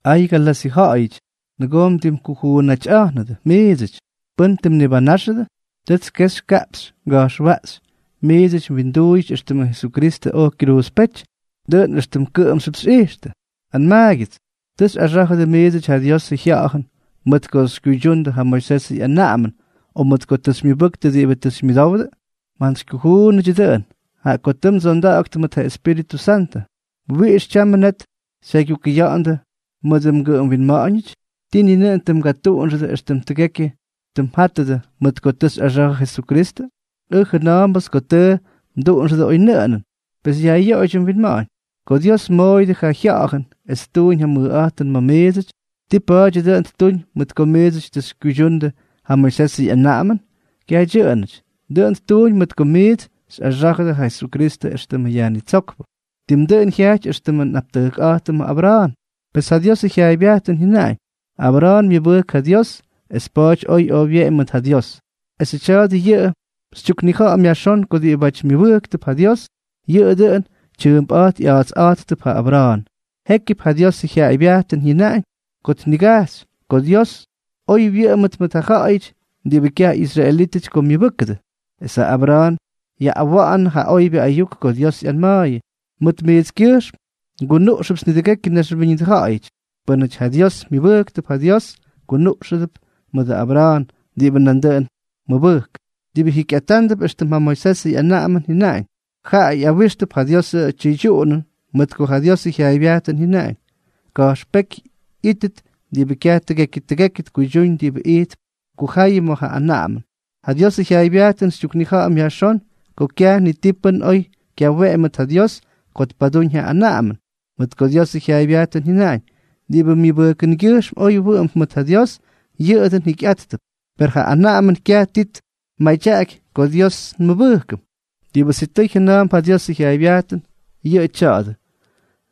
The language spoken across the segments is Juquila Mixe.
¡Ay Galasyʉ ja̱ꞌa̱yʉty! Nʉgoo mdimkujuunꞌatyꞌa̱jnʉdʉ miidsʉty. ¿Pʉ́n tʉ mnibanáxʉdʉ? Tʉts kexy kaꞌpxy nga̱jxwaꞌxy miits mwinduuyʉty éxtʉmʉ Jesukristʉ oj kyruuzpéty, dʉꞌʉn éxtʉm kʉꞌʉmxyʉp xꞌijxtʉ. Anmaagyʉts, ¿tʉ xyꞌaxá̱jʉdʉ miidsʉty ja Diosʉ Jya̱ꞌa̱jʉn mʉt ko tʉ xykyuydyundʉ ja Moisesʉ ꞌyanaꞌamʉn, o mʉt ko tʉ xymyʉbʉktʉ diꞌibʉ tʉ xymyʉdowdʉ? ¡Mjantsykyujuunʉdyʉ dʉꞌʉn! Jaꞌa ko tʉ mdsonda̱ꞌa̱ktʉ mʉt ja Espíritʉ Santʉ, ¿wiꞌix tyamʉ net xyajkugʉxʉya̱ꞌa̱ndʉ mʉdʉ mgʉꞌʉm winma̱ꞌa̱ñʉty? ¿Tii ni nʉꞌʉn tʉ mgatuꞌunxʉdʉ éxtʉm tʉgekyʉ tʉ mjátʉdʉ mʉt ko tʉ xyꞌaxa̱jʉ Jesukristʉ? Ʉj jʉna̱a̱mbʉts ko tʉ mduꞌunxʉdʉ oynʉꞌʉnʉn. Pes yajꞌyoꞌoydyʉ mwinma̱ꞌa̱ñ. Ko Dios mmoꞌoyʉdʉ yʉ Jya̱ꞌa̱jʉn es ttuñ ja mʉjꞌa̱jtʉn ma̱ miidsʉty, ¿ti pa̱a̱dyʉ dʉꞌʉn ttuñ mʉt ko miidsʉty tʉ xykyuydyundʉ ja Moisesʉ ꞌyanaꞌamʉn? Kyaj dyʉꞌʉnʉty, dʉꞌʉn ttuñ mʉt ko miits xyꞌaxá̱jʉdʉ ja Jesukristʉ éxtʉmʉ Yajnitsókpʉ. Tim dʉꞌʉn jyajty éxtʉmʉ nꞌaptʉjkꞌa̱jtʉmʉ Abra̱a̱n, pes ja Diosʉ jyaaybyajtʉn jyʉnaꞌañ: “Abra̱a̱n myʉbʉjk ja Dios, es pa̱a̱ty oj oy wyeꞌemy mʉt ja Dios.” Esʉ tya̱a̱dʉ yʉꞌʉ xytyuknija̱ꞌa̱m yajxón ko diꞌibáty myʉbʉjktʉp ja Dios, yʉꞌʉ dʉꞌʉn tyʉʉmpꞌa̱jt ꞌya̱a̱tsꞌa̱jttʉp ja Abra̱a̱n. Jékyʉp ja Diosʉ jyaaybyajtʉn ñiga̱jx ko Dios oy wyʉꞌʉmʉt mʉt ja ja̱ꞌa̱yʉty diꞌibʉ kyaj ꞌyisraelítʉty ko myʉbʉ́kʉdʉ, es ja Abra̱a̱n yaꞌꞌawa̱ꞌa̱nʉ ja oybyʉ ayuk ko Dios ꞌyanma̱a̱yʉ: “Mʉt mijtskyʉjxm ngunuꞌxʉpts nidʉgekyʉ naxwíñʉdʉ ja̱ꞌa̱yʉty.” Pʉ́nʉty ja Dios myʉbʉjktʉp, jaꞌa Dios kunuꞌxánʉdʉp mʉdʉ Abra̱a̱n, diꞌibʉ nandʉꞌʉn mʉbʉjk. Diꞌibʉ jikyꞌatándʉp éxtʉm ja Moisesʉ ꞌyanaꞌamʉn jyʉnaꞌañ, jaꞌa ꞌyawijxtʉp ja Diosʉ tyʉydyuꞌunʉn, mʉt ko ja Diosʉ jyaaybyajtʉn jyʉnaꞌañ: “Ka̱jxpéky ꞌyítʉt diꞌibʉ kyaj tʉgekyʉ tʉgekyʉ tkuydyúñ diꞌibʉ ijtp kujayʉ ma̱ yʉ anaꞌamʉn.” Ja Diosʉ jyaaybyajtʉn xytyuknija̱ꞌa̱m yajxón ko kyaj ni pʉ́n oy kyaweꞌemy mʉt ja Dios ko tpadúñ ja anaꞌamʉn. Mʉt ko Diosʉ jyaaybyajtʉn jyʉnaꞌañ: “Diꞌibʉ myʉbʉjkʉngyʉjxm oy wʉꞌʉmp mʉt ja Diosʉ, yʉꞌʉ dʉꞌʉn jikyꞌátʉp.” Per ja anaꞌamʉn kyaj ti tmadyaꞌaky ko Dios nmʉbʉjkʉm; diꞌibʉ sitʉy jʉna̱a̱mp ja Diosʉ jyaaybyajtʉn, yʉꞌʉ tya̱a̱dʉ: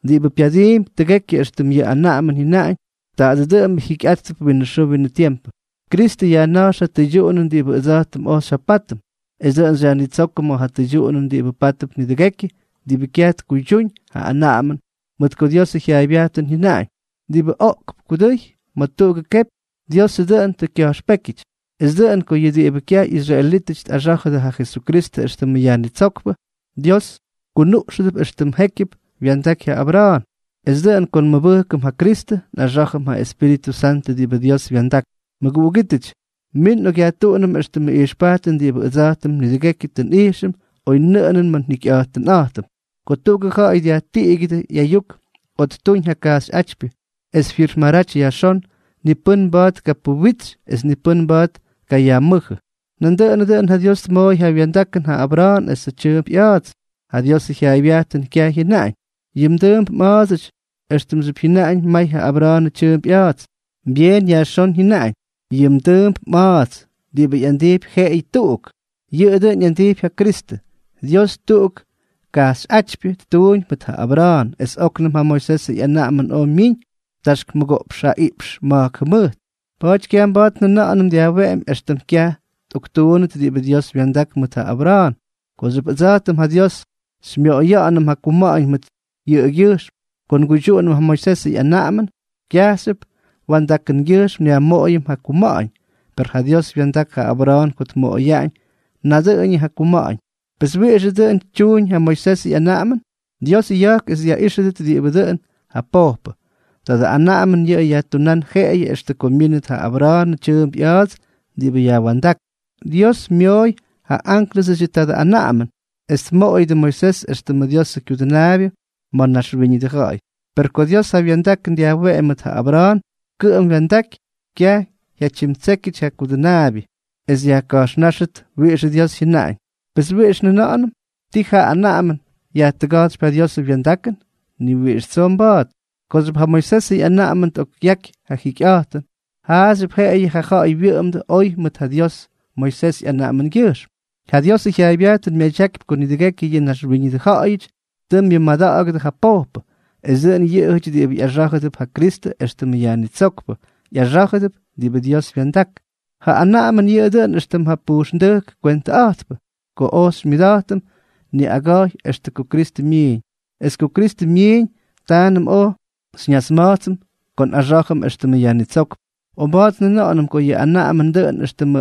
“Diꞌibʉ pyadiimpy tʉgekyʉ éxtʉm yʉ anaꞌamʉn jyʉnaꞌañ, tadʉ dʉꞌʉmbʉ jikyꞌátʉp winʉ xʉʉ winʉ tiempʉ.” Kristʉ yajna̱jx ja tʉydyuꞌunʉn diꞌibʉ ʉdsa̱jtʉm oj xyjapátʉm, es dʉꞌʉn xyajnitsókʉm ma̱ ja tʉydyuꞌunʉn diꞌibʉ pátʉp nidʉgekyʉ diꞌibʉ kyaj tkuydyúñ ja anaꞌamʉn, mʉt ko Diosʉ jyaaybyajtʉn jyʉnaꞌañ: “Diꞌibʉ oꞌkp kudʉy ma̱ tuꞌugʉ kepy, Diosʉ dʉꞌʉn tʉ kya̱jxpékyʉty.” Es dʉꞌʉn ko yʉ diꞌibʉ kyaj ꞌyisraelítʉty tꞌaxá̱jʉdʉ ja Jesukristʉ éxtʉmʉ Yajnitsókpʉ, Dios kunuꞌxʉdʉp éxtʉm jékyʉp wya̱ndaky ja Abra̱a̱n. Es dʉꞌʉn ko nmʉbʉjkʉm ja Kristʉ, nꞌaxá̱jʉm ja Espíritʉ Santʉ diꞌibʉ Dios wya̱ndak. Mʉguꞌugítʉty, min nꞌokꞌyajtuꞌunʉm éxtʉmʉ ijxpajtʉn diꞌibʉ ʉdsa̱jtʉm nidʉgekyʉ tʉ nꞌijxʉm oynʉꞌʉnʉn ma̱ njikyꞌa̱jtʉnꞌa̱jtʉm. Ko tuꞌugʉ ja̱ꞌa̱y dyajtiꞌigyʉdʉ ꞌyayuk o ttuñ ja kajxyꞌátypyʉ es tfirmaraty yajxón, ni pʉ́n mba̱a̱t tkapuwitsy es ni mba̱a̱t tkayajmʉ́jʉ. Nandʉꞌʉnʉ dʉꞌʉn ja Dios tmooy ja wya̱ndakʉn ja Abra̱a̱n es ja tyʉʉmp ꞌya̱a̱ts. Ja Diosʉ jyaaybyajtʉn kyaj jyʉnaꞌañ: “Yʉ mdʉʉmp mꞌa̱a̱dsʉty”, éxtʉmxyʉp jyʉnaꞌañ may ja Abra̱a̱nʉ tyʉʉmp ꞌya̱a̱dsʉty. Byeen yajxón jyʉnaꞌañ: “Yʉ mdʉʉmp mꞌa̱a̱ts”, diꞌibʉ ꞌyandijpy jeꞌeyʉ tuꞌuk. Yʉꞌʉ dʉn ꞌyandijpy ja Kristʉ. Dios tuꞌugʉ kajxyꞌátypyʉ ttuuñ mʉt ja Abra̱a̱n, es óknʉm ja Moisesʉ ꞌyanaꞌamʉn oj myiñ taxk mʉgoꞌpx jaꞌiꞌpx ma̱jk jʉmʉjt. Pa̱a̱ty kyaj mba̱a̱t ja anaꞌamʉn dyajweꞌemy éxtʉm kyaj tꞌoktuunnʉt diꞌibʉ Dios wya̱ndak mʉt ja Abra̱a̱n. Kooxyʉp ʉdsa̱jtʉm ja Dios xymyoꞌoya̱ꞌa̱nʉm ja kuma̱ꞌa̱ñ mʉt yʉꞌʉgyʉjxm ko nguydyuꞌunʉm ja Moisesʉ ꞌyanaꞌamʉn, kyajxyʉp wa̱ndakʉngyʉjxm nyajmoꞌoyʉm ja kuma̱ꞌa̱ñ. Per ja Dios wya̱ndak ja Abra̱a̱n ko tmoꞌoyaꞌañ nadʉꞌʉñʉ ja kuma̱ꞌa̱ñ. Pes, ¿wiꞌixʉ dʉn tyuñ ja Moisesʉ ꞌyanaꞌamʉn? Dios ya̱jk es dyaꞌíxyʉty diꞌibʉ dʉꞌʉn ja pojpʉ. Tadʉ anaꞌamʉn yʉꞌʉ jatunán jeꞌeyʉ extʉ ko myínʉt ja Abra̱a̱n tyʉʉmp ꞌya̱a̱ts diꞌibʉ yajwa̱ndák. Dios myooy ja ánklʉsʉdyʉ tadʉ anaꞌamʉn, es tmoꞌoyʉdʉ Moisés éxtʉmʉ Diosʉ kyudʉnaabyʉ ma̱ naxwíñʉdʉ ja̱ꞌa̱y. Per ko Dios ja wa̱ndakʉn dyajweꞌemy mʉt ja Abra̱a̱n, kʉꞌʉm twa̱ndaky, kyaj jyatyimtsékyʉty ja kudʉnaabyʉ es yajka̱jxnáxʉt wiꞌixʉ Dios jyʉnaꞌañ. Pes, ¿wiꞌix njʉna̱ꞌa̱nʉm? ¿Tii ja anaꞌamʉn yajtʉga̱jtsypy ja Diosʉ wya̱ndakʉn? ¡Ni wiꞌix tsoo mba̱a̱t! Kooxyʉp ja Moisesʉ ꞌyanaꞌamʉn tꞌokꞌyaky ja jikyꞌa̱jtʉn, jaꞌaxyʉp jeꞌeyʉ ja ja̱ꞌa̱y wyʉꞌʉmdʉ oy mʉt ja Dios Moisés ꞌyanaꞌamʉngyʉjxm. Ja Diosʉ jyaaybyajtʉn myadyakypy ko nidʉgekyʉ yʉ naxwíñʉdʉ ja̱ꞌa̱yʉty tʉ myʉmada̱ꞌa̱gʉdʉ ja pojpʉ, es dʉꞌʉn yʉꞌʉyʉty diꞌibʉ ꞌyaxá̱jʉdʉp ja Kristʉ éxtʉmʉ Yajnitsókpʉ, ꞌyaxá̱jʉdʉp diꞌibʉ Dios wya̱ndak. Ja anaꞌamʉn yʉꞌʉ dʉꞌʉn éxtʉm ja pujxndʉjk kwentʉꞌa̱jtpʉ ko oj xymyʉda̱jtʉm niꞌaga̱jy extʉ ko Kristʉ myiiñ, es ko Kristʉ myiiñ, taanʉm oj xyñasma̱jtsʉm ko nꞌaxá̱jʉm éxtʉmʉ Yajnitsókpʉ. O mba̱a̱t njʉna̱ꞌa̱nʉm ko yʉ anaꞌamʉn dʉꞌʉn éxtʉmʉ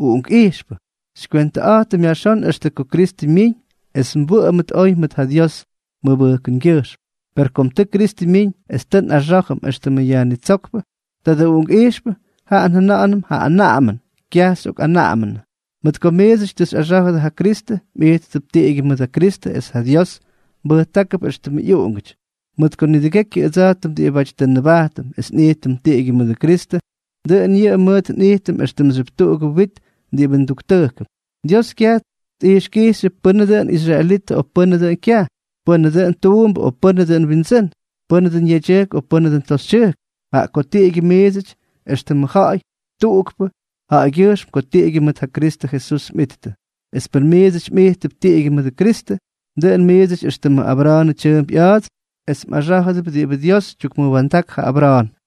uꞌunkꞌijxpʉ, xykywentʉꞌa̱jtʉm yajxón extʉ ko Kristʉ myiiñ es nwʉꞌʉmʉt oy mʉt ja Dios mʉbʉjkʉngyʉjxm. Per kom tʉ Kristʉ myiñ es tʉ nꞌaxá̱jʉm éxtʉmʉ Yajnitsókpʉ, tadʉ uꞌunkꞌijxpʉ, jaꞌa njʉna̱ꞌa̱nʉm ja anaꞌamʉn, kyaj xyꞌokꞌanaꞌamʉnʉ. Mʉt ko miidsʉty tʉ xyꞌaxá̱jʉdʉ ja Kristʉ, mꞌijttʉp tiꞌigyʉ mʉdʉ Kristʉ es ja Dios mbʉjtákʉp éxtʉmʉ ꞌyuꞌungʉty, mʉt ko nidʉgekyʉ ʉdsa̱jtʉm diꞌibáty tʉ nnʉbajtʉm es nꞌijtʉm tiꞌigyʉ mʉdʉ Kristʉ, dʉꞌʉn yʉꞌʉ mʉʉt nꞌijtʉm éxtʉmxyʉp tuꞌugʉ wit diꞌibʉ nduktʉjkʉm. Dios kyaj tꞌijxkijxyʉ pʉnʉ dʉꞌʉn israelitʉ o pʉnʉ dʉꞌʉn kyaj, pʉnʉ dʉꞌʉn tuumbʉ o pʉnʉ dʉꞌʉn windsʉ́n, pʉnʉ dʉꞌʉn yedyʉjk o pʉnʉ dʉꞌʉn toxytyʉjk, jaꞌa ko tiꞌigyʉ miidsʉty éxtʉmʉ ja̱ꞌa̱y tuꞌukpʉ jaꞌagyʉjxm ko tiꞌigyʉ mʉt ja Kristʉ Jesús mꞌittʉ. Es pʉn miits mꞌijttʉp tiꞌigyʉ mʉdʉ Kristʉ, dʉꞌʉn miidsʉty éxtʉmʉ Abra̱a̱nʉ tyʉʉmp ꞌya̱a̱ts es mꞌaxá̱jʉdʉp diꞌibʉ Dios tyukmʉwa̱ndak ja Abra̱a̱n.